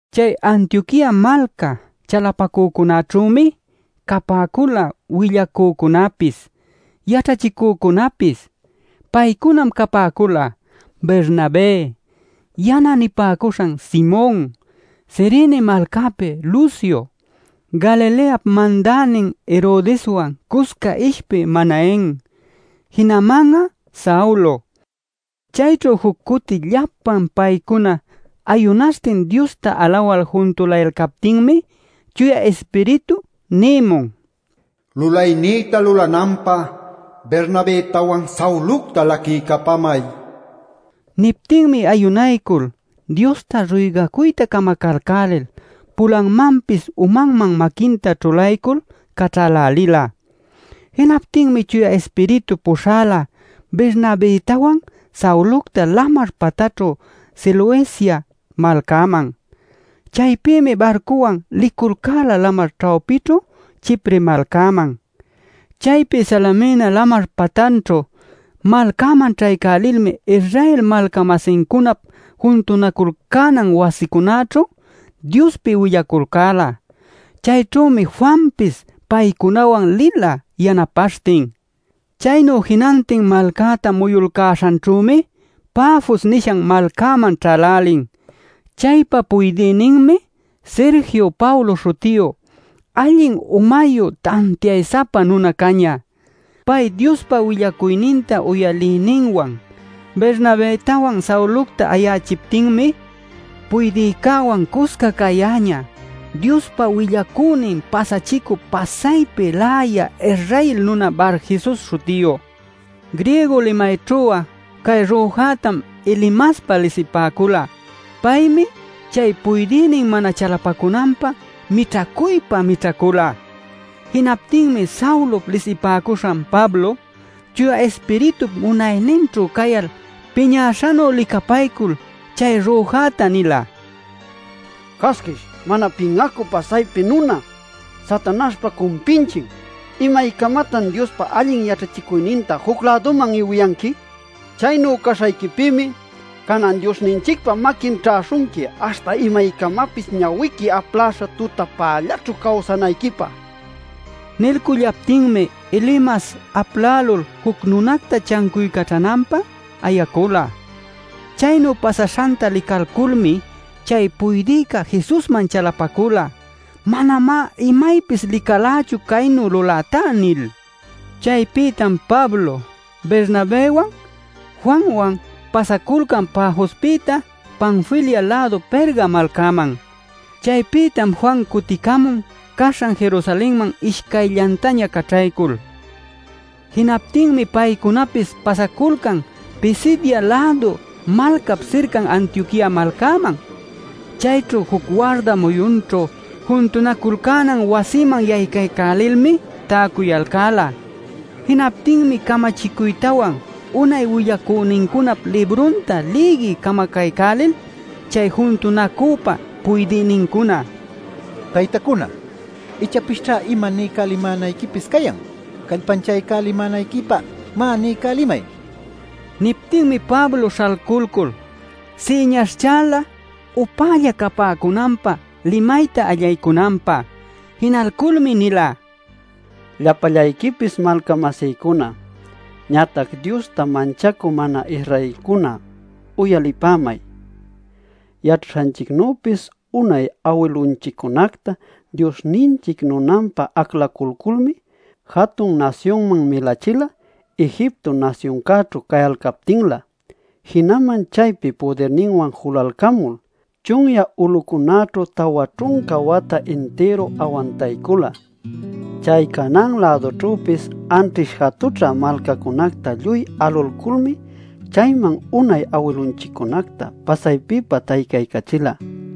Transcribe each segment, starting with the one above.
Chay Antioquia malca chalapacücunäćhümi capäcula willacücunäpis, yaćhachicücunäpis. Paycunam capäcula, Bernabé, “Yana” nipäcuśhan Simon, Cirene malcapi Lucio, Galileap mandänin Herodeswan cusca ishpï Manaen, jinaman'a Saulo. Chayćhu juc cuti llapan paycuna ayunaśhtin Diosta alawal juntulayalcaptinmi Chuya Ispiritu nïmun: “Lulaynïta lulananpä Bernabëtawan, Saulocta laquiycapamay” nil. Niptinmi ayunaycul Diosta ruygacuyta camacalcälil pulanmanpis umanman maquinta ćhulaycul caćhälälila. Jinaptinmi Chuya Ispiritu puśhala Bernabëtawan Saulocta lamar patanćhu Seleucia malcäman. Chaypïmi barcuwan liculcäla lamar ćhawpićhu Chipre malcäman. Chaypi Salamina lamar patanćhu malcäman ćhaycälilmi Israel malca-masincunap juntunaculcänan wasicunaćhu Diospi willaculcäla. Chayćhümi Juanpis paycunawan lila yanapaśhtin. Chaynu jinantin malcäta muyulcäśhanćhümi Pafos nishan malcäman ćhälälin. Chaypa puydïninmi Sergio Paulo śhutiyu, allin umayu tantiay-sapa nuna cañä. Pay Diospa willacuyninta uyalïninwan Bernabëtawan Saulocta ayachiptinmi puydïcäwan cusca cayäñä Diospa willacünin pasachicü pasaypi läya Israel nuna Barjesus śhutiyu. Griego limayćhu'a cay rüjätam Elimaspa lisipäcula. Paymi chay puydïnin mana chalapacunanpä mićhacuypa mićhacula. Jinaptinmi Saulop lisipäcuśhan Pablo, Chuya Ispiritup munayninćhu cayal piñäśhanu licapaycul chay rüjäta nila: “¡Casquish, mana pin'acü pasaypi nuna, Satanaśhpa cumpinchin! ¡¿Imaycamatan Diospa allin yaćhachicuyninta juc-läduman iwiyanqui?! Chaynu caśhayquipïmi canan Diosninchicpa maquin ćhäśhunqui aśhta imaycamapis ñawiqui apläśha tutapällaćhu cawsanayquipä” nin. Nilcullaptinmi Elimas aplälul juc nunacta chancuycaćhananpä ayacula. Chaynu pasaśhanta licalculmi chay puydïca Jesusman chalapacula “Manamá imaypis licalächu caynu lulätá” nil. Chaypïtam Pablo, Bernabëwan, Juanwan pasaculcan Pafospïta, Panfilia-lädu Perga malcäman. Chaypïtam Juan cuticamun caśhan Jerusalenman ishcayllantaña caćhaycul. Jinaptinmi paycunapis pasaculcan Pisidia-lädu malcap sircan Antioquia malcäman. Chayćhu juc warda muyunćhu juntunaculcänan wasiman yaycaycälilmi täcuyalcäla. Jinaptinmi camachicuytawan unay willacünincunap librunta lïgiy camacalcälil chay juntunacüpa puydïnincuna: “Taytacuna, ichapisćha ima niycälimänayquipis cayan callpanchaycälimänayquipä. Má, niycälimay” nipäcula. Niptinmi Pablo śhalculcul, siñaśhchala upälla capäcunanpä limayta allaycunanpä. Jinalculmi nila: “Llapallayquipis malca-masïcuna, ñatac Diosta manchacü mana-Israelcuna, uyalipämay. Yaćhaśhanchicnüpis unay awilunchiccunacta Diosninchic nunanpä aclaculculmi, jatun nasyunman milachila Egipto nasyuncäćhu cayalcaptinlä. Jinaman chaypi pudirninwan julalcamul, chunyä ulucunaćhu tawa ćhunca wata intiru awantaycula. Chay Canaan-lädućhüpis anćhish jatućhä malcacunacta lluy alulculmi chayman unay awilunchiccunacta pasaypipa taycaycachila.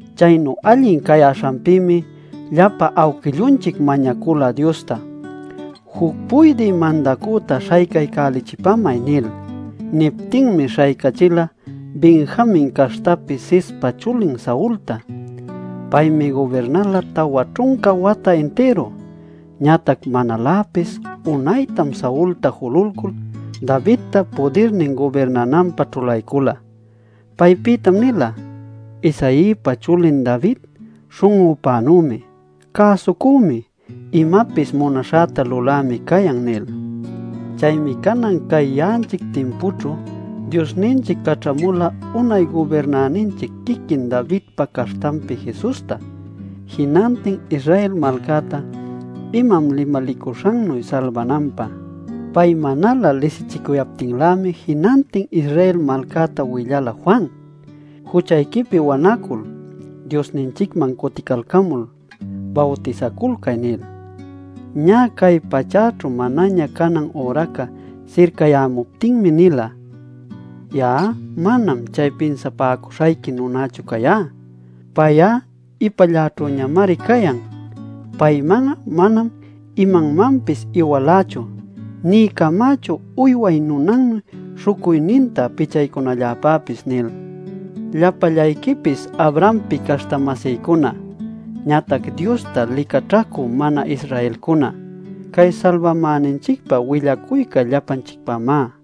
Chaynu allin cayäśhanpïmi llapa awquillunchic mañacula Diosta: ‘Juc puydï mandacüta śhaycaycälichipämay’ nil. Niptinmi śhaycachila Benjamin caśhtapi Cispa chulin Saulta. Paymi gubirnala tawa ćhunca wata intiru. Ñatac manaläpis unaytam Saulta jululcul, Davidta pudirnin gubirnananpä ćhulaycula. Paypïtam nila: ‘Isaïpa chulin David śhun'üpänümi, cäsucümi, imapis munaśhäta lulämi cayan’ nil. “Chaymi canan cay ya'anchic timpućhu, Diosninchic caćhamula unay gubirnäninchic quiquin Davidpa caśhtanpi Jesusta, jinantin Israel malcäta imam limalicuśhannuy salbananpä. Pay manalä lisichicuyaptinlämi jinantin Israel malcäta willala Juan: ‘Juchayquipi wanacul, Diosninchicman cuticalcamul, bawtisaculcay’ nil. Ñä cay pachäćhu manaña canan üraca sircayämuptinmi nila: ‘Ya'a manam chay pinsapäcuśhayqui nunächu cayá. Pay'a ipalläćhüñamari cayan. Payman'a manam imanmanpis iwalächu nï camächu uyway nunannuy śhucuyninta pichaycunalläpäpis’ nil. “Llapallayquipis Abrahampi caśhta-masïcuna, ñatac Diosta licaćhacü mana-Israelcuna, cay salbamäninchicpä willacuyca llapanchicpämá.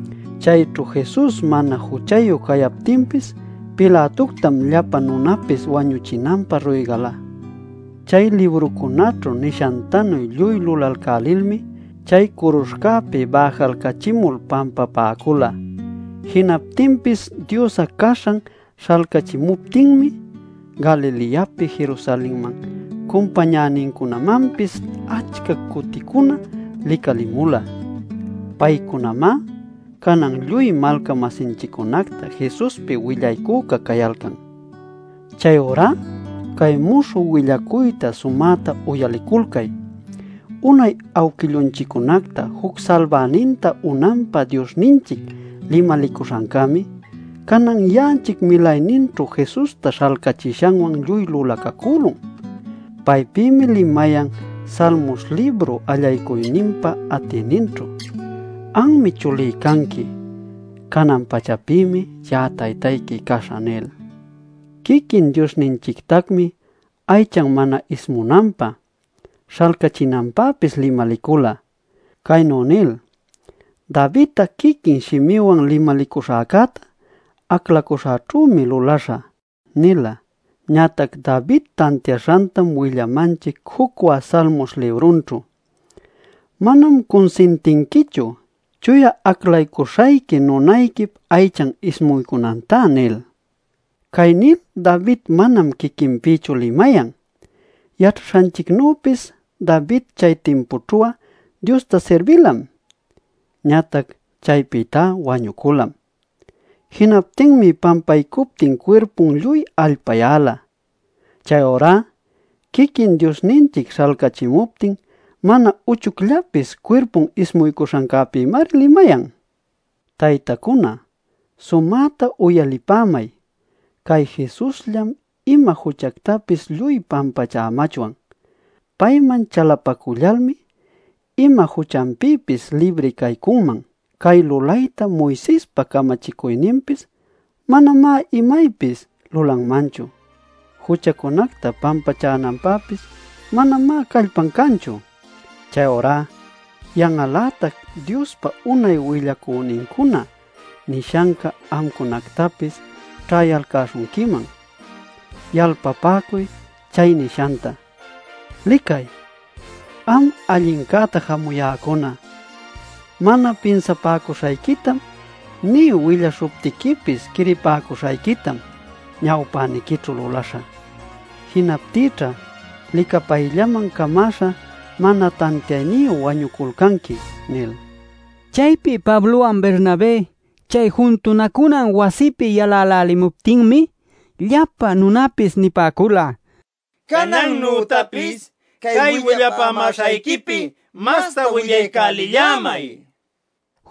Chayćhu Jesus mana juchayu cayaptinpis Pilatoctam llapa nunapis wañuchinanpä ruygala. Chay librucunäćhu nishantanuy lluy lulalcälilmi, chay curuśhcäpi bäjalcachimul pampapäcula. Jinaptinpis Dios caśhan śhalcachimuptinmi Galileapi Jerusalenman cumpañänincunamanpis achca cuticuna licalimula. Paycunamá canan lluy malca-masinchiccunacta Jesuspi willaycüca cayalcan. “Chayurá cay muśhü willacuyta sumäta uyaliculcay: Unay awquillunchiccunacta juc salbäninta unanpä Diosninchic limalicuśhancämi canan ya'anchic milayninćhu Jesusta śhalcachishanwan lluy lulacacülun. Paypïmi limayan Salmos libru allaycuyninpa atïninćhu: ‘Anmi chulí canqui; canan-pachapïmi ya'a taytayqui caśhä’ nil. “Quiquin Diosninchictacmi aychan mana ismunanpä, śhalcachinanpäpis limalicula, caynu nil: ‘Davidta quiquí shimïwan limalicuśhäcätá aclacuśhäćhümi lulaśha’ nila. Ñatac David tantiaśhantam willamanchic jucwä Salmos librunćhu: ‘Manam cunsintinquichu Chuya Aclacuśhayqui nunayquip aychan ismuycunantá’ nil. “Cay nil David manam quiquinpïchu limayan. Yaćhaśhanchicnüpis David chay timpućhu'a Diosta sirbilam, ñatac chaypïtá wañuculam. Jinaptinmi pampaycuptin cuirpun lluy allpayäla. Chayurá quiquin Diosninchic śhalcächimuptin mana uchucllapis cuirpun ismuycuśhancäpïmari limayan. “Taytacuna, sumäta uyalipämay. Cay Jesusllam ima juchactapis lluy pampachämachwan. Payman chalapacullalmi ima juchanpïpis libri caycunman. Cay lulaytá Moisespa camachicuyninpis manamá imaypis lulanmanchu; juchacunacta pampachänanpäpis manamá callpan canchu. “Chayurá yan'al-lätac Diospa unay willacünincuna nishanca amcunactapis ćhayalcäśhunquiman. Yalpapäcuy chay nishanta: ‘Licay, am allincäta jamuyäcuna. Mana pinsapäcuśhayquitam nï willaśhuptiquipis quiripäcuśhayquitam ñawpäniquićhu lulaśhä. Jinaptïćha licapayllaman camäśha mana tantiayniyu wañuculcanqui’ nil” nila. Chaypi Pablowan Bernabé chay juntunacunan wasipi yalälälimuptinmi, llapa nunapis nipäcula: “Canannütapis cay willapämäśhayquipi masta willaycälillämay” nil.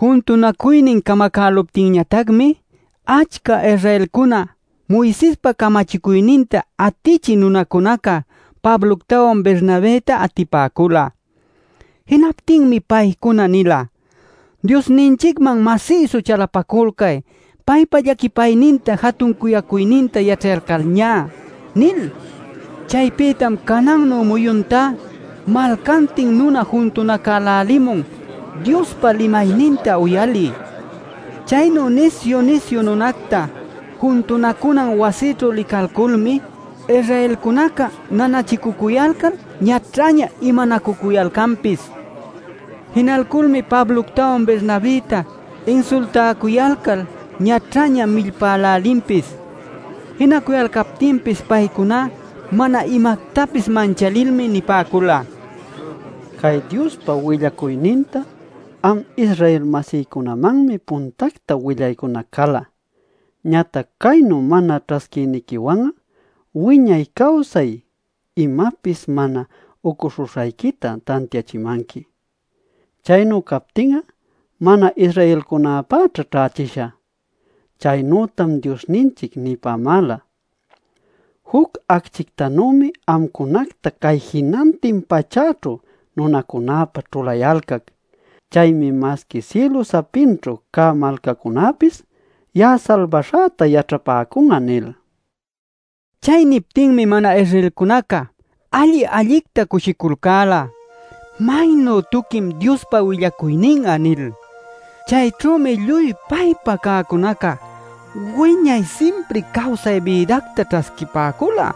Juntunacuynin camacäluptinñatacmi, achca Israelcunaca Moisespa camachicuyninta atichï munäcunaca Pabloctawan Bernabëta atipäcula. Jinaptinmi paycuna nila: “Diosninchicman masïsu chalapaculcay paypa llaquipayninta jatun cuyacuyninta yaćhayalcalñá” nil. Chaypïtam canannu muyuntá malcantin nuna juntunacälälimun Diospa limayninta uyalï. Chaynu nisyu-nisyu nunacta juntunacunan wasićhu licalculmi Israelcunaca nanachicucuyalcal ñaćhaña imanacücuyalcanpis. Jinalculmi Pabloctawan Bernabëta insultäcuyalcal ñaćhaña millpälälinpis. Jinacuyalcaptinpis paycuna mana imactapis manchalilmi nipäcula: “Cay Diospa willacuyninta am Israel-masïcunamanmi puntacta willaycunac cala. Ñatac caynu mana ćhasquïniquiwan'a wiñay cawsay imapis mana ucuśhuśhayquita tantiachimanqui. Chaynu captin'a mana-Israelcunapäćha ćhächishä. Chaynütam Diosninchic nipämäla: ‘Juc acchictanümi amcunacta cay jinantin pachäćhu nunacunäpä ćhulayalcac. Chaymi masqui sïlüpa sapinćhu cä malcacunäpis ya'a salbaśhäta yaćhapäcun'a’ nil” nila. Chay niptinmi mana-Israelcunaca alli-allicta cushiculcäla “Maynu tuquim Diospa willacuynin'a” nil. Chayćhümi lluy paypä cäcunaca wiñay simpri cawsay bïdacta ćhasquipäcula.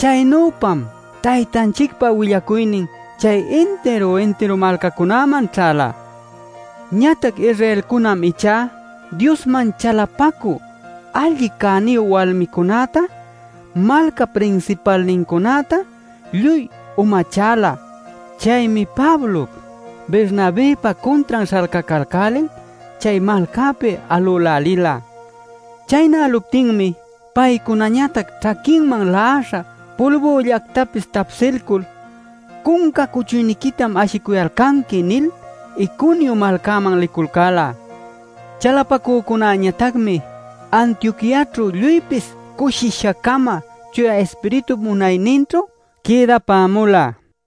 Chaynüpam Taytanchicpa willacuynin chay intiru-intiru malcacunäman ćhäla. Ñatac Israelcunam ichá Diosman chalapacü allin cäniyu walmicunäta, malcap prinsipalnincunäta lluy umachäla. Chaymi Pablop, Bernabëpa cuntran śhalcacalcälil chay malcapi alülälila. Chaynäluptinmi paycunañatac ćhaquinman la'aśhan pulbüllactapis tapsilcul “Cunca cuchuyniquitam ashicuyalcanqui” nil Iconio malcäman liculcäla. Chalapacücunäñatacmi Antioquiaćhu lluypis cushisha-cama Chuya Ispiritup munayninćhu quïdapämula.